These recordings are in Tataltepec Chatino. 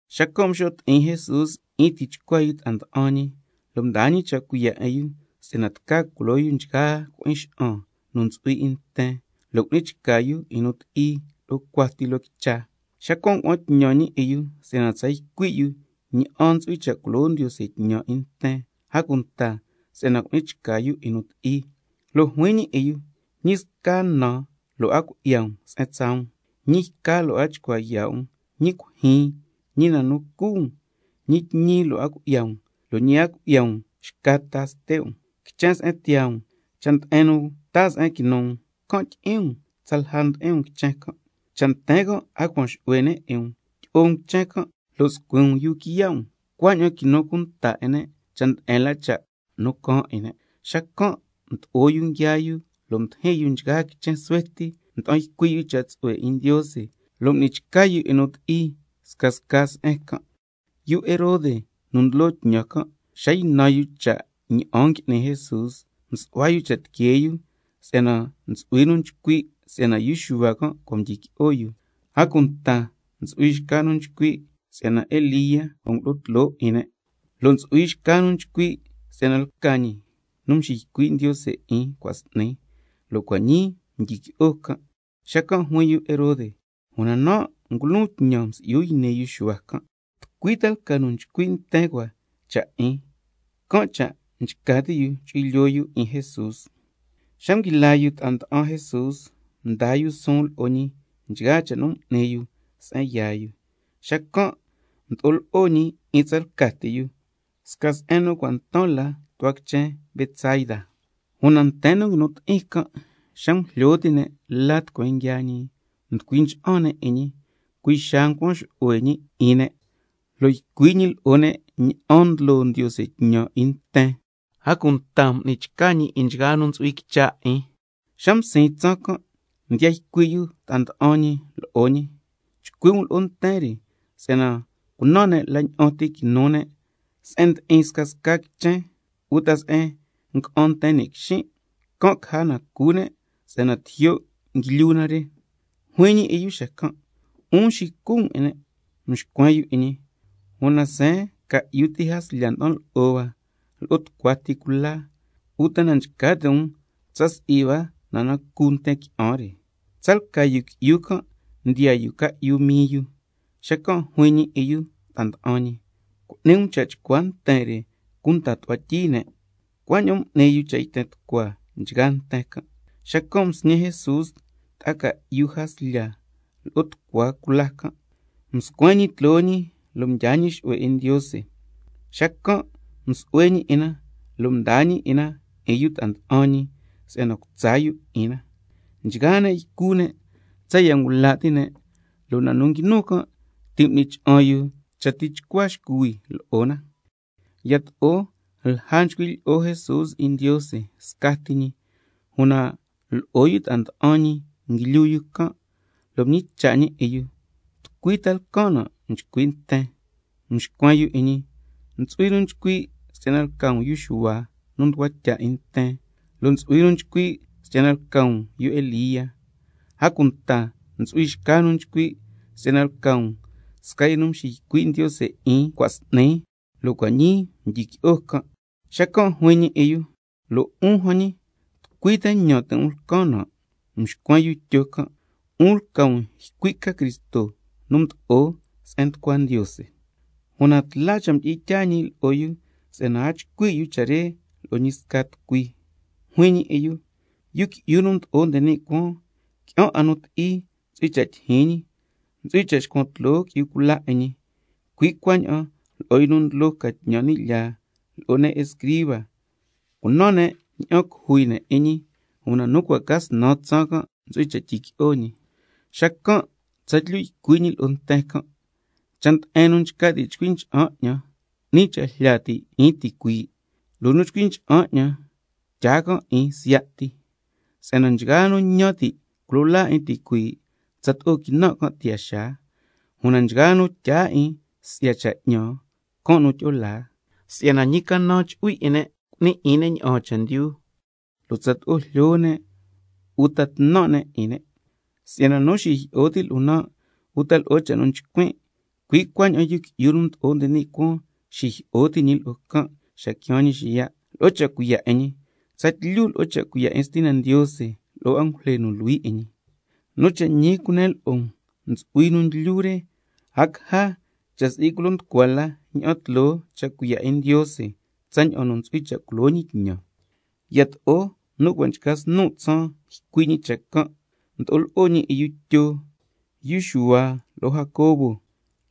Xacan' mxo' ti'in Jesús 'in tichcua yu ta'a nda'an ñi, lo' mdaa ñi cha' cuiya' 'in yu si'yana tca culo yu nchgaa loo cui'in xa'an nu ntsu'hui 'in nten, lo' cu'ni chca yu 'in nu ti'i lo'o cuati loo quicha. Xacan' ngua'an tñan ñi 'in yu si'yana tsa ycui' yu ña'an ntsu'hui cha' culo Ndiose tñan 'in nten, a cunta si'yana cu'ni chca yu 'in nu ti'i. Lo' juin ñi 'in yu: Ñi sca na lo' a cui'ya um se'en tsaa um, ñi yca lo' a chcua yaa' um, ñi cuijyin, ñi na cu um, ñi tñi a cui'ya um, lo' ñi a cui'ya um xca ta ste' um. Quichen se'en tiyaa um, cha' nde'en nu taa se'en quinu um, can' tyi'in um tsalja ndi'in um quichen can'. Cha' nten can' a cuan xu'hue ne' 'in um, tyi'o um quichen can' lo' scuin um yuu quiya' um, cuaña'an quinu cunta 'in ne' cha' nde'en la cha' nu caan 'in ne'. Xacan' mdo'o yu nguiaa yu lo' mdijin yu scasca quichen suhue ti, mda'an ycui' yu cha' tsu'hue 'in Ndiose, lo' m'ni chca yu 'in nu ti'i scasca se'en can'. Yu Herode nu ndlo tñan can', xa ynan yu cha' ña'an ngui'ni Jesús, msu'hua yu cha' tiquee yu si'yana ntsu'hui nu nchcui' si'yana yu Xuhua can' cua' mdyiqui'o yu, a cunta ntsu'hui xca nu nchcui' si'yana Elía cua' ngulo'o tloo 'in ne', lo' ntsu'hui xca nu nchcui' si'yana lca ñi scasca la nu mxiycui' Ndiose 'in cua' s'ni, lo' cua' ñii mdyiqui'o can'. Xacan' juin yu Herode: Una nan' ngulon tñan msi'yu yni yu Xuhua can', ¿tucui ta lca nu nchcui' nten cua cha' 'in? Can' cha' nchca ti' yu chu'hui lyoo yu 'in Jesús. Xa nguila yu ta'a mda'an Jesús, mdaa yu suun lo'o ñi nchgaa cha' nu m'ni yu se'en yaa yu. Xacan' mdo'o lo'o ñi 'in tsalca ti yu, sca se'en nu cua' ntan la tu'hua quichen Betsaida. Una nten nu nguinu ti'in can' xa ngujlyo ti' ne' la tucueen nguiaa ñi, mducui ncha'an ne' 'in ñi, cui' xaa ncuan xu'hue ñi 'in ne', lo' ycui' ñi lo'o ne' ña'an ndlo Ndiose tñan 'in nten, a cunta m'ni chca ñi 'in nchgaa nu ntsu'hui quicha 'in. Xa msiin tsaan can' mdiya ycui' yu ta'a nda'an ñi lo'o ñi: Chcui' um lo'o nten re si'yana cunan ne' se'en quinu ne' se'en ndi'in scasca quichen uta se'en nga'an nten ni' quixin', can' caja na cu ne' si'yana tijyo' nguilyu na re. Juin ñi 'in yu xacan': 'Un xicu um 'in ne'. Mxcuen yu 'in ñi: Una seen ca'yu ti jaslya nda'an lo'o hua lo'o tucua ti cula, uta na nchca ti' um tsa si'i hua na nu cu nten qui'an re. Tsalca yu qui'yu can' ndiyaa yu ca'yu mii yu. Xacan' juin ñi 'in yu ta'a nda'an ñi: Cu'ni um cha' chcua nten re cunda tu'hua tyii ne'. Cuaña'an m'ni yu cha' yten tucua nchgaa nten can'. Xacan' msñi Jesús ta'a ca'yu jaslya lo'o chcua cula can', lo' mscuen ñi tloo ñi nde cuaan, mdyaa ñi xu'hue 'in Ndiose, xacan' msu'hue ñi 'in na, lo' mdaa ñi 'in na 'in yu ta'a nda'an ñi si'yana cutsa yu 'in na. Nchgaa ne' ycu ne' tsaya' ngula' ti' ne', lo' na nu nguinu can' ti' m'ni cha'an yu cha tichcua xcuhui lo'o na. Yato'o lja nchcui' lyi'o Jesús 'in Ndiose scati ñi, una lo'o yu ta'a nda'an ñi nguilyu can', lo' mñicha' ñi 'in yu: ¿Tucui ta lcan nan' nchcui' nten? Mxcuen yu 'in ñi: Ntsu'hui nu nchcui' si'yana lca um yu Xuhua nu mducua tya 'in nten, lo' ntsu'hui nu nchcui' si'yana lca um yu Elía, a cunta ntsu'hui xca nu nchcui' si'yana lca um sca yu nu mxiycui' Ndiose 'in cua' s'ni, lo' cua' ñii mdyiqui'o can'. Xacan' juin ñi 'in yu: Lo' 'un jan ñi, ¿tucui ñan ti' um lcan nan'? Mxcuen yu Tyo can': 'Un lca um ycui' ca Cristo nu mdo'o se'en nducua Ndiose. Una tla cha' mdi'in tyaa ñi lo'o yu si'yana a chcui' yu cha' re lo'o ñi sca tucui. Juin ñi 'in yu: Yu Qui'yu nu Mdo'o nde ni' Cuaan, qui'an 'a nu ti'i ntsu'hui cha' tyijyin ñi, ntsu'hui cha' xcuan tloo qui'yu cula 'in ñi, cui' cuaña'an lo'o yu nu ndlo ca tñan ni' lyaa lo'o ne' escriba, cunan ne' ña'an cujui ne' 'in ñi, una nu cua' ca snan tsaan ntsu'hui cha' tyiqui'o ñi. Xacan' tsatlyu ycui' ñi lo'o nten can': Cha' nde'en nu nchca ti' chcui cha'an 'ñan, 'ni cha' jlya ti' can' 'in, lo' nu chcui ncha'an 'ñan, tyaa can' 'in siya' ti. Si'yana nchgaa nu ñan ti' culo laa 'in, tsato'o quinan' can' tiyaa xaa, una nchgaa nu tyaa chendyu 'in 'ñan, can' nu tyi'o laa. ¿Si'yana ñi canan chu'hui 'in ne' cu'ni 'in ne' ña'aan chendyu, lo' tsato'o jlyo ne' uta tnan' ne' 'in ne'? Si'yana nu xijyi'o ti' lo'on nan' uta lo'o cha' nu nchcuin', cui' cuaña'an Yu Qui'yu nu Mdo'o nde ni' Cuaan xijyi'o ti' ñi lo'o can' xa quiaan ñi xiya' lo'o cha' cuiya' 'in ñi, tsatlyu lo'o cha' cuiya' 'in Stina Ndiose lo'o angujle nu luhui 'in ñi. Nu cha' ñi cunen lo'o um, ntsu'hui nu ndlyu re, a caja cha' si'i culo nducua la ña'an tloo cha' cuiya' 'in Ndiose tsaña'an nu ntsu'hui cha' culo ñi tñan. Yato'o nu cua' nchca snu' tsaan ycui' ñi cha' can', mdo'o lo'o ñi 'in yu Tyo, yu Xuhua lo'o Jacobo,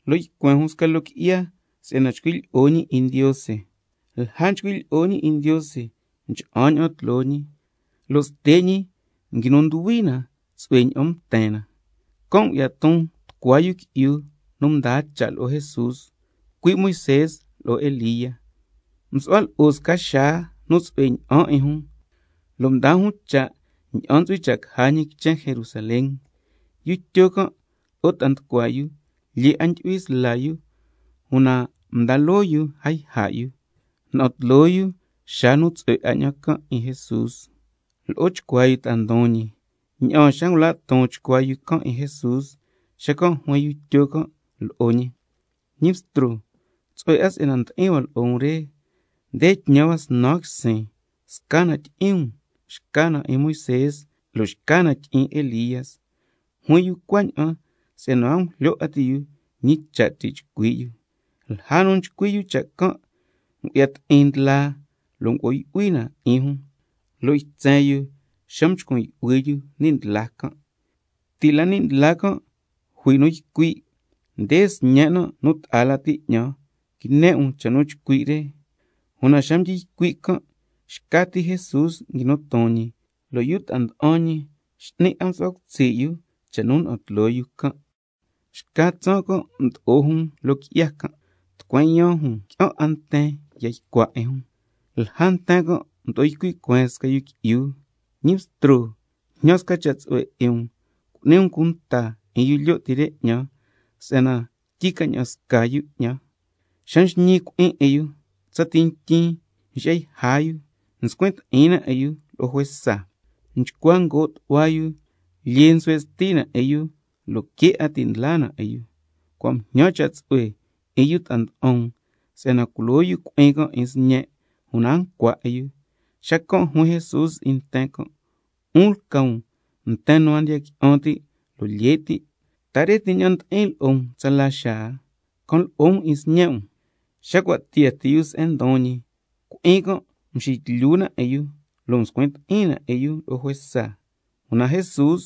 lo' ycuen jun sca loo qui'ya si'yana chcui' lyi'o ñi 'in Ndiose. Lja nchcui' lyi'o ñi 'in Ndiose mcha'an ña'an tloo ñi, lo' ste' ñi nguinu nduhui na tsu'hue ña'an mten na. Can' ngu'ya ton tucua yu qui'yu nu ndaa cha' lo'o Jesús, cui' Moisé lo'o Elía, msu'hua lo'o sca xaa nu tsu'hue ña'an 'in jun, lo' ndaa jun cha' ña'an ntsu'hui cha' caja ñi quichen Jerusalén. Yu Tyo can' lo'o ta'a nducua yu lyee 'a ndyu'hui sla yu, una mdaa loo yu a yja' yu, na'an tloo yu xaa nu tsu'hue 'a ña'an can' 'in Jesús lo'o chcuaa yu ta'a ndon ñi. Ña'aan xa ngula' ton chcuaa yu can' 'in Jesús, xacan' juin yu Tyo can' lo'o ñi: Ñi Bstro, tsu'hue si'yana ndi'in hua lo'o um re, nde tñan hua snan quisin, sca na tyi'in um, xca na 'in Moisé, lo' xca na tyi'in Elía. Juin yu cuaña'an si'yana a ngujlyo 'a ti' yu ñi cha' ti' chcui' yu. Lja nu ti' nchcui' yu cha' can', ngu'ya ti'in ndlaa lo' ngo'o yu'hui na 'in jun, lo' ytsen yu xa mchcun yu'hui yu ni' ndlaa can'. Ti' la ni' ndlaa can' jui nu ycui': Nde Sñen' nan' nu ta'a lati 'ñan, quine 'in um cha' nu chcui' re. Una xa mdyi ycui' can', xca ti Jesús nguinu ton ñi, lo' yu ta'a nda'an ñi x'ni 'a msu'hua cutsi' yu cha' nu na'an tloo yu can'. Xca tsaan can' mdo'o jun loo qui'ya can', tucueen yaan jun qui'an 'a nten ya ycua 'in jun. Lja nten can' mdo'o ycui' cueen sca yu qui'yu: Ñi Bstro, jñan sca cha' tsu'hue 'in um cu'ni cunta um 'in yu lyo' ti re 'ñan, si'yana tyi ca ña'an sca yu 'ñan. Xa nxñi cui'in 'in yu, tsati ntyin nxi'ya yja yu, nscuin ti'in na 'in yu lo'o juesa, nchcua ngoo' tu'hua yu, lyee nsuhue' sti na 'in yu, lo' que' 'a ti' ndla na 'in yu. Cua' mjñan cha' tsu'hue 'in yu ta'a nda'an um si'yana culo yu cui'in can' 'in sñen', una a ncua 'in yu. Xacan' juin Jesús 'in nten can': 'Un lca um nten nu a ndiya qui'an ti', lo' lye' ti'. ¿Ta re ti ña'an ndi'in lo'o um tsala xaa? Can lo'o um 'in sñe' um. Xa cua' tiyaa ti yu se'en ndon ñi, cui'in can' mxitlyu 'in yu lo' mscuin ti'in na 'in yu lo'o juesa, una Jesús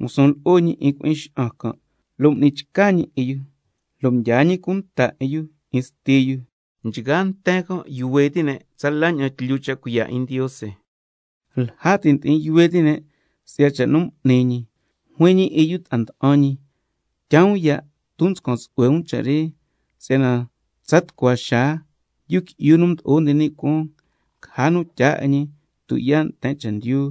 ngusun lo'o ñi 'in cui'in xa'an can' lo' m'ni chca ñi 'in yu, lo' mdyaa ñi cunta 'in yu 'in sti yu. Nchgaa nten can' yuhue ti' ne' tsala ña'an tlyu cha' cuiya' 'in Ndiose. Lja ti' ndi'in yuhue ti' ne' si'ya cha' nu m'ni ñi, juin ñi 'in yu ta'a nda'an ñi: Tyaa um ya' ton nscan tsu'hue um cha' re, si'yana tsa tucua xaa Yu Qui'yu nu Mdo'o nde ni' Cuaan, caja nu tyaa 'in ñi tuyaa' nten chendyu.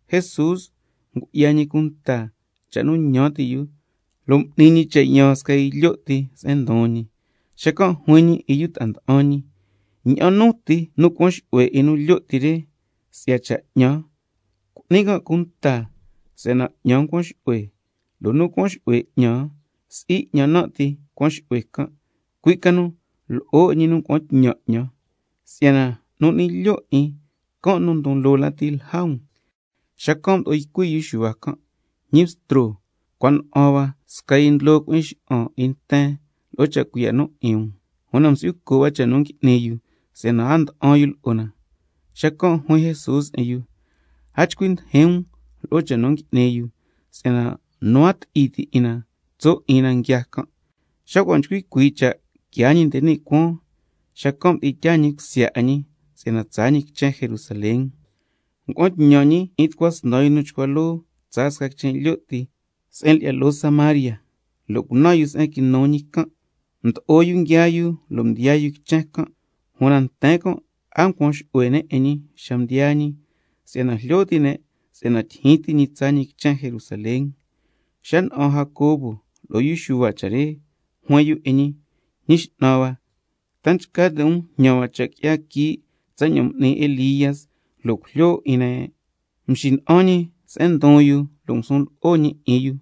Jesús ngu'ya ñi cunta cha' nu ñan ti' yu, can' cha' m'ni ñi cha' yaan sca nu lyo' ti se'en ndon ñi, lo' juin ñi 'in yu ta'a nda'an ñi: Ña'an nu ti nu cuan xu'hue 'in nu lyo' ti re si'ya cha' 'ñan, cu'ni can' cunta si'yana 'ñan cuan xu'hue. Lo' ña'an nu ti nu cuan xu'hue 'ñan, si'i 'ñan nan' ti cuan xu'hue can', cui' ca nu lo'o 'in nu ngua'an tñan 'ñan. Si'yana nu n'ni lyo' 'in, can' nu ndon loo lati lja um. Xacan' mdo'o ycui' yu Xuhua can': Ñi Bstro, cua na'an hua sca yu nu ndlo cui'in xa'an 'in nten lo'o cha' cuiya' 'in um, una msi'yu co' hua cha' nu ngui'ni yu si'yana a nda'an yu lo'o na. Xacan' juin Jesús lo'o yu: A chcui ndijin um lo'o cha' nu ngui'ni yu, si'yana nu a ti'i ti' 'in na, tso' 'in na nguiaa can'. Xa cua' nchcui cuii' cha' quiaa ñi nde ni' cuaan, xacan' mdi'in tyaa ñi cusya 'in ñi si'yana tsaa ñi quichen Jerusalén. Xacan' ngua'an tñan ñi 'in tucua snan yu nu chcua loo tsaa sca quichen lyo' ti se'en lyi'ya loo Samaria lo' cunan yu se'en quinu ñi can'. Mdo'o yu nguiaa yu lo' mdiyaa yu quichen can', una nten ndi'in can' a ncuan xu'hue ne' 'in ñi xa mdiyaa ñi, si'yana jlyo ti' ne' tyijyin ti ñi tsaa ñi quichen Jerusalén. Xa na'an Jacobo lo'o yu Xuhua cha' re, juin yu 'in ñi: Ñi X'nan hua, ¿ta nchca ti' um jñan hua cha' qui'ya quii' tsaña'an m'ni yu Elía, lo' cujlyo na 'in ne'? Mxina'an ñi se'en ndon yu lo' ngusun lo'o ñi 'in yu: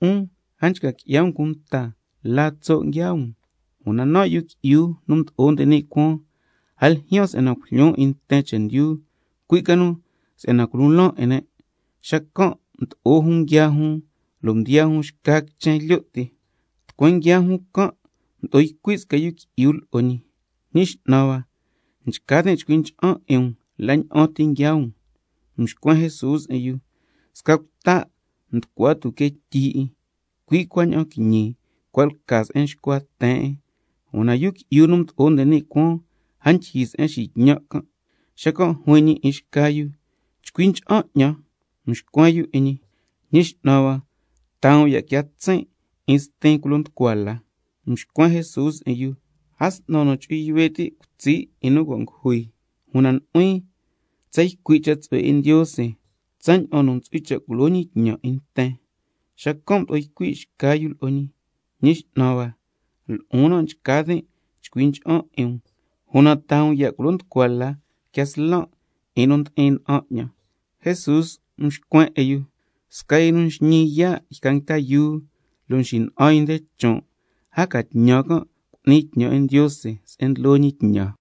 'Un a nchca qui'ya um cunta la tso' nguiaa um, si'yana nan' Yu Qui'yu nu Mdo'o nde ni' Cuaan, a ljyaan si'yana cujlyon 'in nten chendyu, cui' ca nu si'yana culo laan 'in ne'. Xacan' mdo'o jun nguiaa jun lo' mdiyaa jun xca quichen lyo' ti. Tucueen nguiaa jun can' mdo'o ycui' sca yu qui'yu lo'o ñi: Ñi X'nan hua, nchca tin' chcui ncha'an 'in um la ña'an ti nguiaa um. Mxcuen Jesús 'in yu: Sca cuta' nducua tuque tyi 'in, cui' cuaña'an quiñi, cua' lca se'en nxcua ten 'in, una Yu Qui'yu nu Mdo'o nde ni' Cuaan, a ndyijyi se'en xitñan' can'. Xacan' juin ñi 'in xca yu can': Chcui ncha'an 'ñan. Mxcuen yu 'in ñi: Ñi X'nan hua, taa um ya' quia tsin' 'in stin culo nducua la. Mxcuen Jesús 'in yu: A s'nan nu chu'hui yuhue' ti' cutsi' 'in nu cua' ngujui, una nu'huin tsa ycui' cha' tsu'hue 'in Ndiose tsaña'an nu ntsu'hui cha' culo ñi tñan 'in nten. Xacan' mdo'o ycui' xca yu lo'o ñi: Ñi X'nan hua, lo'on nan' nchca tin' chcui ncha'an 'in um, una taa um ya' culo nducua la quia slan' 'in nu ndi'in na'an 'ñan. Jesús mxcuen 'in yu: Sca yu nu nxñi yaa' yca nguita yuu lo' xina'an nde chon', a ca tñan can' cu'ni tñan 'in Ndiose se'en ndlo ñi tñan.